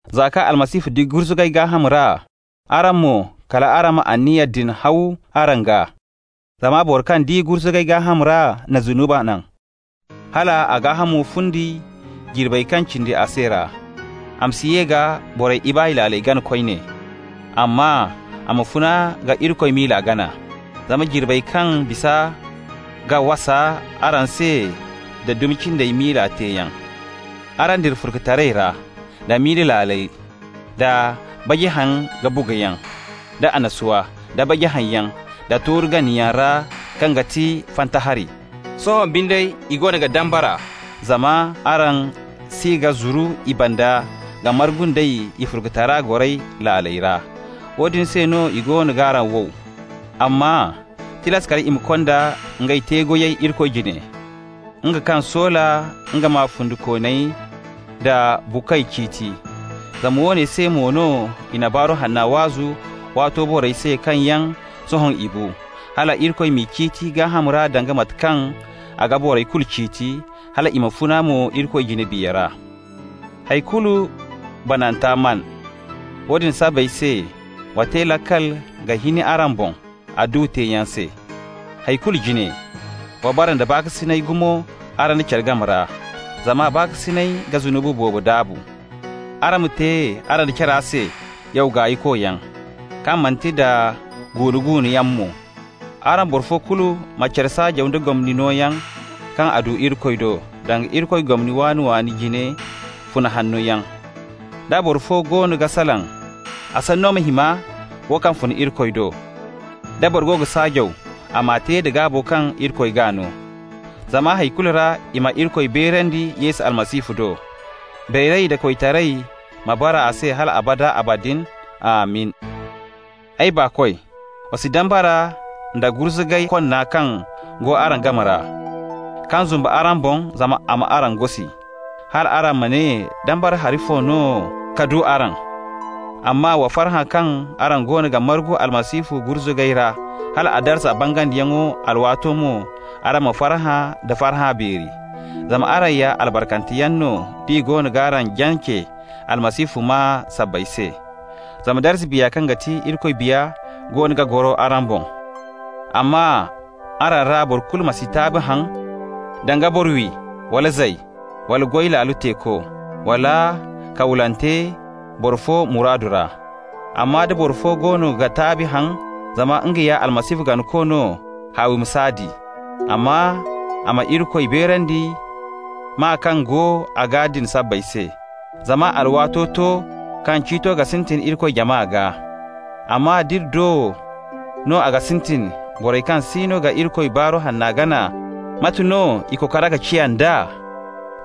Za kaŋ Almasihu di gurzugay gaaham ra, araŋ mo, kal araŋ ma anniya din haw araŋ gaa. Zama boro kaŋ di gurzugay gaaham ra na zunubi naŋ, hal a gaahamo fundi jirbey kaŋ cindi a se ra, a ma si ye ka borey ibaay laaley gana koyne, amma a ma funa ka Irikoy miila gana. Zama jirbey kaŋ bisa ga wasa araŋ se da dumi cindey miila teeyaŋ. Araŋ dira furkutaray ra, da ibaay laaley, da baji haŋ-ka-buguyaŋ, da annasuwa, da baji haŋyaŋ, da tooru ganayaŋ ra kaŋ ga ti fanta hari. Sohõ binde i goono ga dambara zama araŋ si ga zuru i banda ka margu nd'ey i furkutaray goray laaley ra. Woodin se no i goono g'araŋ wow. Amma tilas kal i ma konda ngey te-goyey Irikoy jine, nga kaŋ soola nga ma fundikooney da buukoy ciiti. Zama woone se mo no i na Baaru Hanna waazu waato borey se kaŋ yaŋ sohõ i bu, hal Irikoy m'i ciiti gaaham ra danga mate kaŋ a ga borey kulu ciiti, hal i ma funa mo Irikoy jine biya ra. Hay kulu bananta maan. Woodin sabbay se wa te laakal ka hin araŋ boŋ adduwa teeyaŋ se. Hay kulu jine, wa bara nda baakasinay gumo araŋ da care game ra, zama baakasinay ga zunubi boobo daabu. Araŋ ma te araŋ da care se yaw gaaykoyaŋ, kaŋ manti nda guunu-guunuyaŋ mo. Araŋ boro fo kulu ma care saajaw da gomni nooyaŋo kaŋ a du Irikoy do, danga Irikoy gomni waani-waani jine funa hanno yaŋ. Da boro fo go ga salaŋ, a sanno ma hima wo kaŋ fun Irikoy do. Da boro go ga saajaw, a m'a te da gaabo kaŋ Irikoy g'a no, zama hay kulu ra i ma Irikoy beerandi Yesu Almasihu do. Beeray da koytaray ma bara a se hal abada abadin. Amin! Ay baakoy, wa si dambara nda gurzugay konna kaŋ go araŋ game ra, kaŋ zumbu araŋ boŋ zama a m'araŋ gosi, hal araŋ ma ne dambara hari fo no ka du araŋ. Amma wa farhã kaŋ araŋ goono ga margu Almasihu gurzuga ra, hal a darza bangandiyaŋo alwaato mo, araŋ ma farhã da farhã beeri. Zama araŋ ya albarkanteyaŋ no d'i goono g'araŋ jance Almasihu maa sabbay se. Zama darza Biya kaŋ ga ti Irikoy Biya goono ga goro araŋ boŋ. Amma araŋ ra boro kulu ma si taabi haŋ danga boro-wi wala zay wala goy laalo teeko, wala kawlante boro fo muraadu ra. Amma da boro fo goono ga taabi haŋ zama nga ya Almasihu ganako no, haawi ma s'a di, amma a ma Irikoy beerandi maa kaŋ go a gaa din sabbay se. Zama alwaato to kaŋ ciito ga sintin Irikoy jama gaa. Amma d'iri do no a ga sintin, borey kaŋ siino ga Irikoy Baaru Hanna gana, mate no i kokora ga ciya d'a?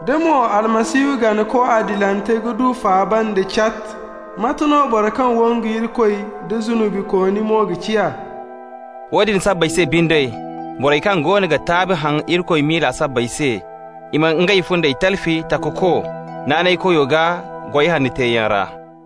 «Da mo Almasihu ganako adilante ga du faaba nda cat, mate no boro kaŋ wangu Irikoy nda zunubikooni mo ga ciya?» Woodin sabbay se binde, borey kaŋ goono ga taabi haŋ Irikoy miila sabbay se, i ma ngey fundey talfi Takako naanaykoyo gaa goy hanno teeyaŋ ra.